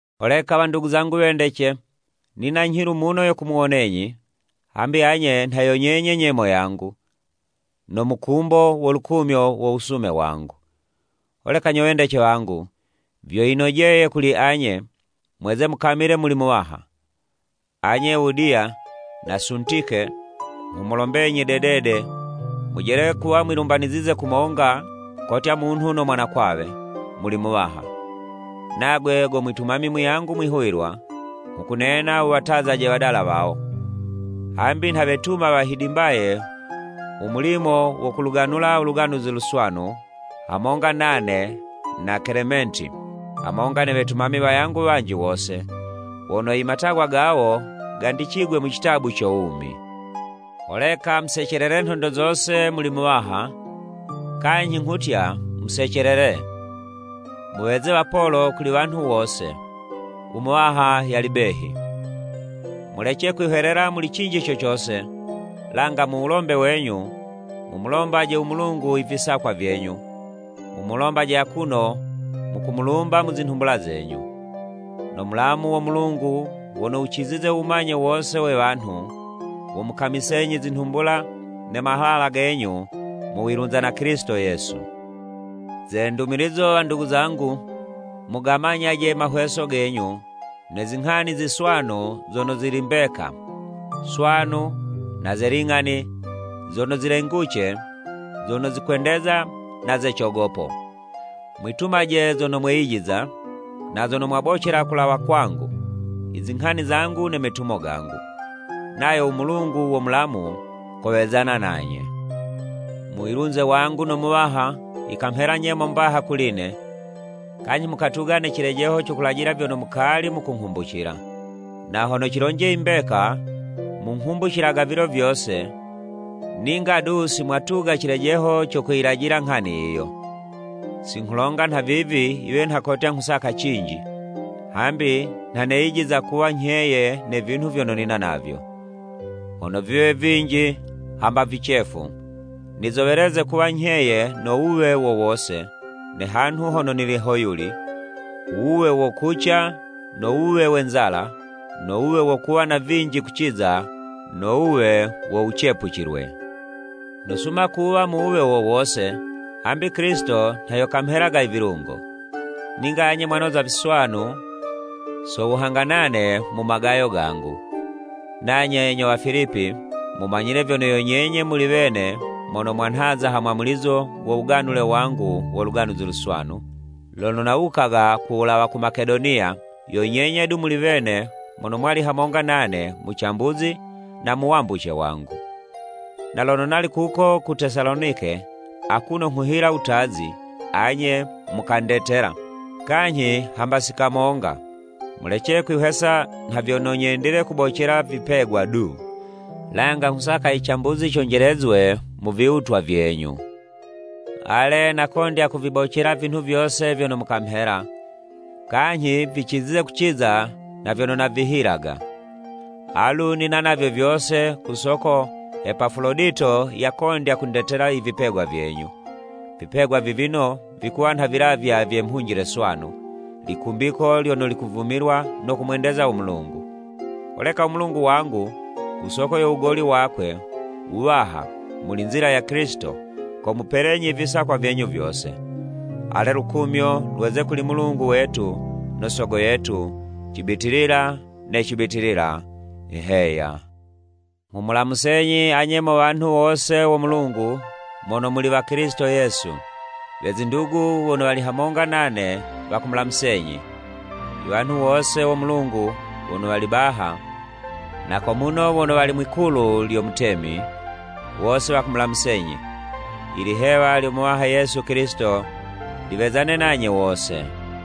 Holeka wandugu zangu wendece, nina nyhilu muno yo kumuwonenyi, hambi anye nha yo nyenye nyemo yangu, no mukumbo wo lukumyo lo wusume wangu. Holeka nyo wendece wangu, vyo yinojeye kuli anye, mweze mukamile muli Muwaha. Anye Ewudiya na Suntike, nghumulombenyi dedede mujele kuwa mwilumbanizize kumonga kotya munhu no mwanakwawe, muli Muwaha. Nagwe go mwitumami muyangu mwihuwilwa, nghukunena wuwatazaje wadala wawo, hambi nha wetuma wahidimbaye u mulimo wo kuluganula u Luganuzi Luswanu, hamonga nane na Kelementi, hamonga ne wetumami wayangu wanji wose, wono i matagwa gawo, gandicigwe mu citabu co wumi. Holeka musecelelele nhondo zose, muli Muwaha! Kanyhi nghutya, Musecelele! Muweze wapolo kuli wanhu wose. U Muwaha yali behi. Mulece kwihwelela muli cinji co cose, langa mu wulombe wenyu, mumulombaje u Mulungu i visakwa vyenyu, mumulombaje akuno mukumulumba mu zinhumbula zenyu. No mulamu wo Mulungu wono wucizize u wumanye wose we wanhu, womukamisenyi zinhumbula ne mahala genyu mu wilunza na Kilisito Yesu. Ze ndumilizo wandugu zangu, mugamemyaje mahweso genyu ne zinghani ziswanu zono zili mbeka, swanu, na ze ling'ani, zono zilenguce, zono zikwendeza na ze cogopo. Mwitumaje zono mweyijiza, na zono mwabocela kulawa kwangu, i zinghani zangu, ne metumo gangu. Nayo u Mulungu wo mulamu, kowezana nanye. Mu wilunze wangu no Muwaha, yikawa nyemo mbaha kuli'ne, kanyhi mukatuga ne cilejeho co kulajila vyono mukali mukunghumbucila. Na hono cilonje i mbeka, munghumbucilaga vilo vyose, ninga du, si mwatuga cilejeho co kuyilajila nghani yiyo. Si nghulonga nhavivi yiwe nha kotya nghusaka cinji, hambi nha neyijiza kuwa nyheye ne vinhu vyono nina navyo, hono viwe vinji hamba vicefu. Nizoweleze kuwa nyheye no wuwe wo wose, ne hanhu hono nili hoyuli; u wuwe wo kuca no wuwe we nzala, no wuwe wo kuwa na vinji kuciza no wuwe wo wucepucilwe. Nosuma kuwa mu wuwe wo wose, hambi Kilisito nha yo kamhelaga i vilungo. Ninga anye mwanoza viswanu so wuhanga nane mu magayo gangu. Nanye nyo Wafilipi mumanyile vyono yo nyenye muli wene mono mwanhaza ha mwamulizo wo wuganule wangu wo Luganuzi Luswanu, lono nawukaga kuwulawa ku Makedoniya, yo nyenye du muli wene mono mwali hamonga nane mu cambuzi na mu wambuce wangu. Na lono nali kuko ku Tesalonike akuno nghuhila wutazi, anye mukandetela, kanyhi hamba si kamonga. Mulece kwihwesa nha vyono nyendile kubocela vipegwa du, langa nghusaka i cambuzi conjelezwe mu viwutwa vyenyu. Ale, nakondya kuvibocela vinhu vyose vyono mukamhela, kanyhi vicizize kuciza na vyono navihilaga. Alu nina navyo vyose ku soko Epafulodito yakondya kundetela i vipegwa vyenyu. Vipegwa vivino vikuwa nha vilavywa vye mhunjile swanu, likumbiko lyono likuvumilwa no kumwendeza u Mulungu. Holeka u Mulungu wangu ku soko yo wugoli wakwe wuwaha mu nzila ya Kilisito, komupelenyi i visakwa vyenyu vyose. Ale u lukumyo lweze kuli Mulungu wetu no Sogo yetu, cibitilila ne cibitilila. Heya. Nghumulamusenyi anye mo wanhu wose wo Mulungu mono muli wa Kilisito Yesu. We zindugu wono wali hamonga nane wakumulamusenyi. I wanhu wose wo Mulungu wono wali baha, na ko muno wono wali Mwikulu lyo Mutemi, wose wakumulamusenyi. Ilihewa lyo Muwaha Yesu Kilisito liwezane nanye wose.